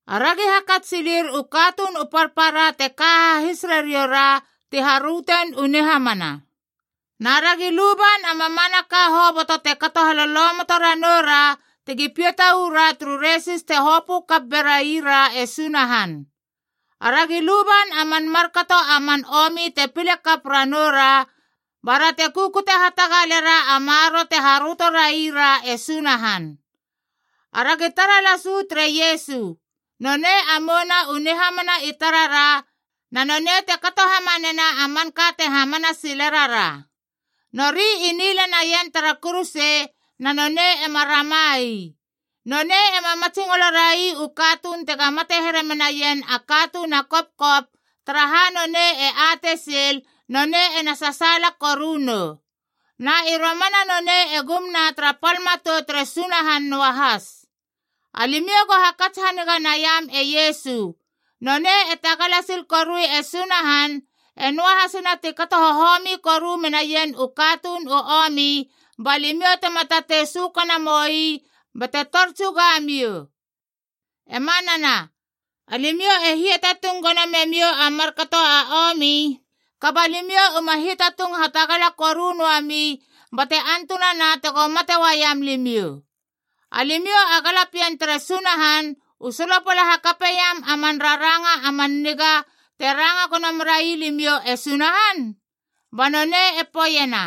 Aragi hakats silir u katuun u parpara te ka hahis rarioura ti harötein u nihamana. Na ragi luban a mamanaka hoboto te kato halolomoto ranoura, tegi piata ura turu resis te hopö kap beraira e Sunahan. Aragi luban a man markato a man omi te pile kap ranoura, bara te kukute hatagalera a maroro te haröto raira e Sunahan. Aragi tara las uu tere Iesu. Nonei a mouna u nihamana i tarara na nonei te kato hamanena a manka te hamana sile rara. Nori i nila naien tara kuruse, na nonei ema rama ii. Nonei ema matsingolo rai u katuun tega mate here menaien a katuun a kopkop, taraha nonei e atei sil nonei ena sasaala koru nou. Na i romana nonei e gumna tara pal matou tere Sunahan noahas. Alimiou go hakats haniga naiam e Iesu. Nonei e tagala sil korui e Sunahan, e noahasina ti kato hohomi koru menaien u katuun u omi, ba limiou tema tatei sökana moi bate tor tsuga miou. E manana, alimiou e hiatatung gono memiou a markato a omi, kaba alimiou uma hiatatung hatagala koru noami bate antunana tego mate uaiam limiou. Alimiou a galapien tere Sunahan u solopala hakapeiam a man raranga a man niga te ranga gono merai limiou e Sunahan? Ba nonei e poeiena,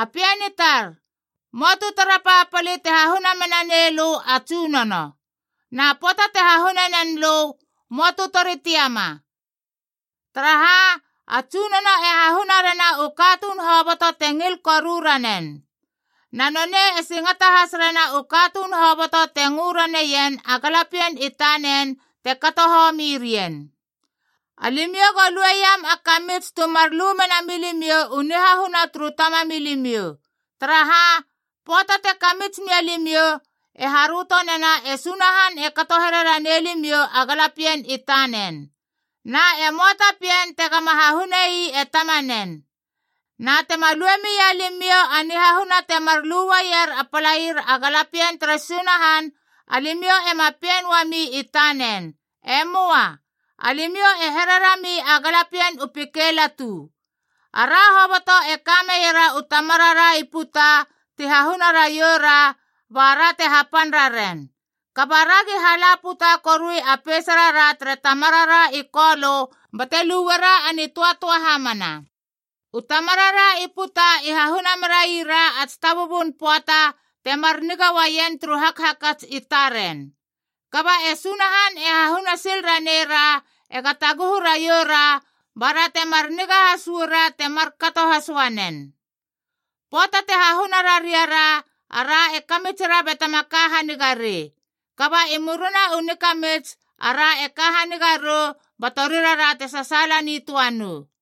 “A pien i tar, möa tu tara papali te hahuna menanei lö a Tsunono. Na pöata te hahune nen lö, möa tu tori tiama. Taraha, a Tsunono e hahuna rena u katuun hoboto te ngil koru ranen. Na, nonei e singata has rena u katuun hoboto te ngö raneien a galapien i tanen te kato homi rien.” Alimiou go lueiam a kamits tu mar lu mena milimiou u nihahuna turu tamamilimiou. Taraha, pöata te kamits mia limiou, e haröto nena e Sunahan e kato here ranei limiou a galapien i tanen. Na e möa ta pien tegama hahunei e tamanen. Na tema lue mia limiou a nihahuna temar lu uaier a palair a galapien tere Sunahan, alimiou ema pien uami i tanen. E möa. Alimiou e here rami a galapien u pikeilatu. Ara hoboto e kameiera u tamarara i puta ti hahuna raiou ra, ba ra te hapan raren. Kaba aragi hala puta korui a peisarara tere Tamarara i Kolö bate luera a nitöatöa hamana. U tamarara i puta i hahuna merai ra a tsitabubun pöata temar niga uaien turu hakhakats i taren. Kaba e Sunahan e hahuna sil ranei ra ega taguhu raiou ra bara temar niga has uara, te markato has uanen. Pöata te hahuna rariara, ara e kamitsira batema ka haniga rei. Kaba i murina u nikamits ara e ka haniga rou ba torirara te sasaala nitöa nou.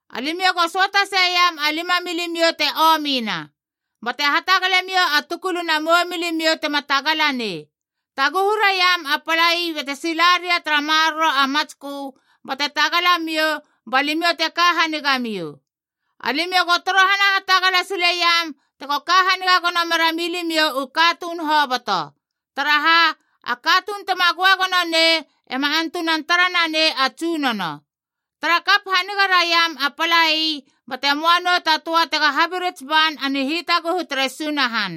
Alimiou go söata seiam a lima milimiou te omina. Bate hatagalemiou a tukuluna mou milimiou tema tagala nei. Taguhu raiam a palai bate sila ria tara maroro a matskö, bate tagala miou ba limiou te ka haniga miou. Alimiou go torohana hatagala sileiam tego ka haniga gono mera milimiou u katuun hoboto. Taraha, a katuun tema göagono nei ema antunan tara nanei a Tsunono. Tara kap haniga raiam a palai bate moa nou ta töa tega habirits ban a nihitaguhu tere Sunahan.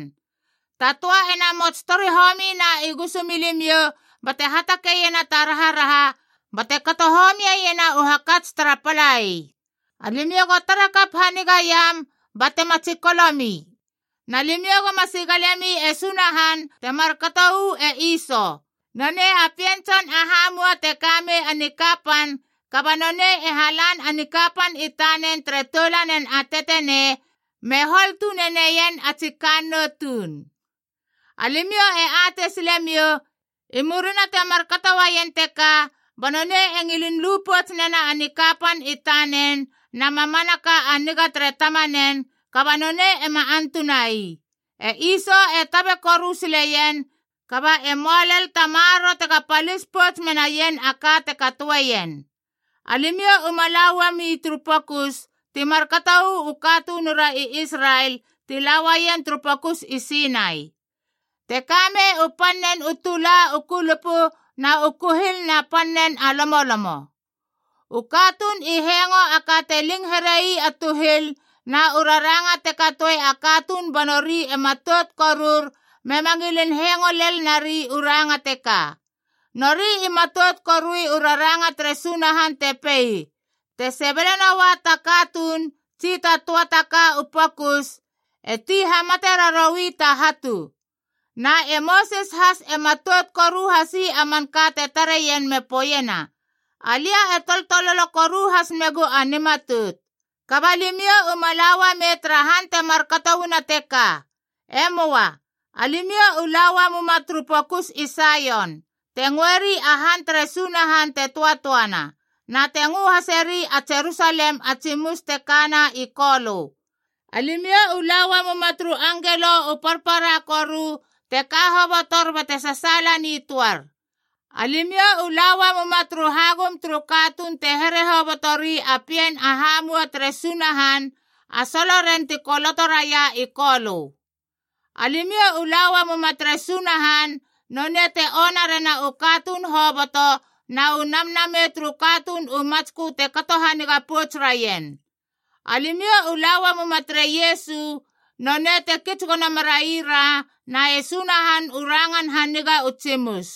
Ta töa ena mots tori homina i gusumilimiou bate hatakeiena ta raharaha bate kato homiena u hakats tara palai. Alimiou go tara kap hanigaiam, batema tsikolo mi. Na limiou goma sigalemi e Sunahan te markato uu e Iso. Nonei a pien tson a hamua te ka mei a nikapan, kaba nonei e halan a nikapan i tanen tere toulanen a tetenei me hol tune neien a tsi kannou tuun. Alimiou e atei silemiou, i murina te markato uaien teka ba nonei e ngilin lu pouts nena a nikapan i tanen na mamanaka a niga tere tamanen, kaba nonei ema antuna ii. E Iso e tabe koru sileien, kaba e möa lel ta maroro tega palis pouts menaien a ka te katoeien. Alimiou uma la uami turu pokus, ti markato uu katunura i Israel ti la uaien turu Pokus i Sinai. Te kamei u pannen u tula u kulupu na u kuhil na pannen a lomolomo. U katuun i hengo a ka te ling herei a tuhil na u raranga te katoi a katuun banori e matout korur mema ngilin hengo lel nari u ranga teka. Nori i matout korui u raranga tere Sunahan te pei, “Te sebele noua ta katuun tsi ta töa ta ka u pokus, e ti hamate raroui ta hatu.” Na e Mosis has e matout koru hasi a manka te tareien me poeiena, “Alia e toltololo koru has megu a nimatout.” Kaba limiou uma la uamei tara han te markato uana teka. E möa. Alimiou u la uamuma turu Pokus i Saion, te ngöeri a han tere Sunahan te töatöana, na te ngö haseri a Jerusalem a Tsimus te kana i Kolö. Alimiou u la uamuma turu angelo u parpara koru te ka hobotor bate sasaala nitöar. Alimiou u la uamuma turu hagum turu katuun te here hoboto ri a pien a hamua tere Sunahan, a soloren ti koloto raia i Kolö. Alimiou u la uamuma tere Sunahan, nonei te ona rena u katuun hoboto, na u namnamei turu katuun u matskö te kato haniga pouts raien. Alimiou u la uamuma tere Iesu, nonei te kits gono meraira na e Sunahan u rangan haniga u tsimus.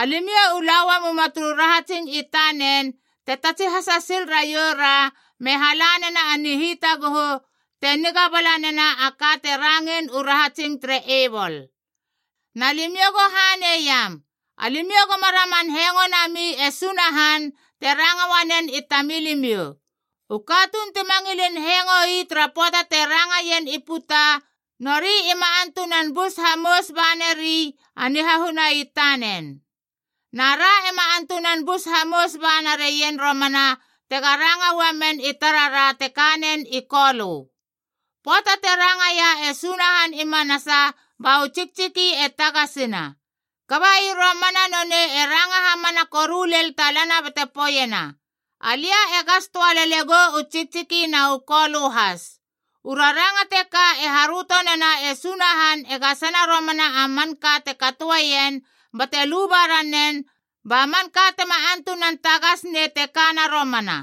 Alimiou u la uamuma turu rahatsing i tanen te tatsihasa sil raioura me hala nena a nihitaguhu, te niga bala nena a ka te rangein u rahatsing tere Ebol. Na limiou go haneiam. Alimiou goma raman hengo nami e Sunahan te ranga uanen i tamilimiou. U katuun tima ngilin hengo ii tara pöata te ranga ien i puta, nori ima antunan bus hamous banari a nihahuna i tanen. Na ra ema antunan bus hamous ba narien romana tega ranga uamen i tarara te kanen i Kolö. Pöata te rangaia e Sunahan i manasa, ba u tsiktsiki e tagasina. Kaba i romana nonei e ranga hamana koru lel talana bate poeiena, “Alia e gas töa lele gou u tsiktsiki na u kolö has.” U raranga teka e haröto nena e Sunahan e gasena romana a manka te katoeien bate luba ranen ba manka tema antunan tagas nei te kana romana.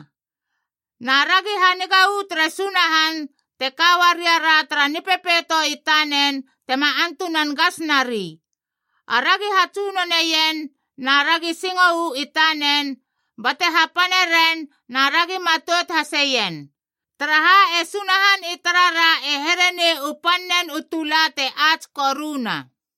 Na ragi haniga uu tere Sunahan te ka uaria ra tara nipepeito i tanen tema antunan gas nari. Aragi hatsunoneien na ragi singo uu i tanen, bate hapane ren na aragi matout haseien. Taraha, e Sunahan i tarara e here nei u pan nen u tula te ats koruna.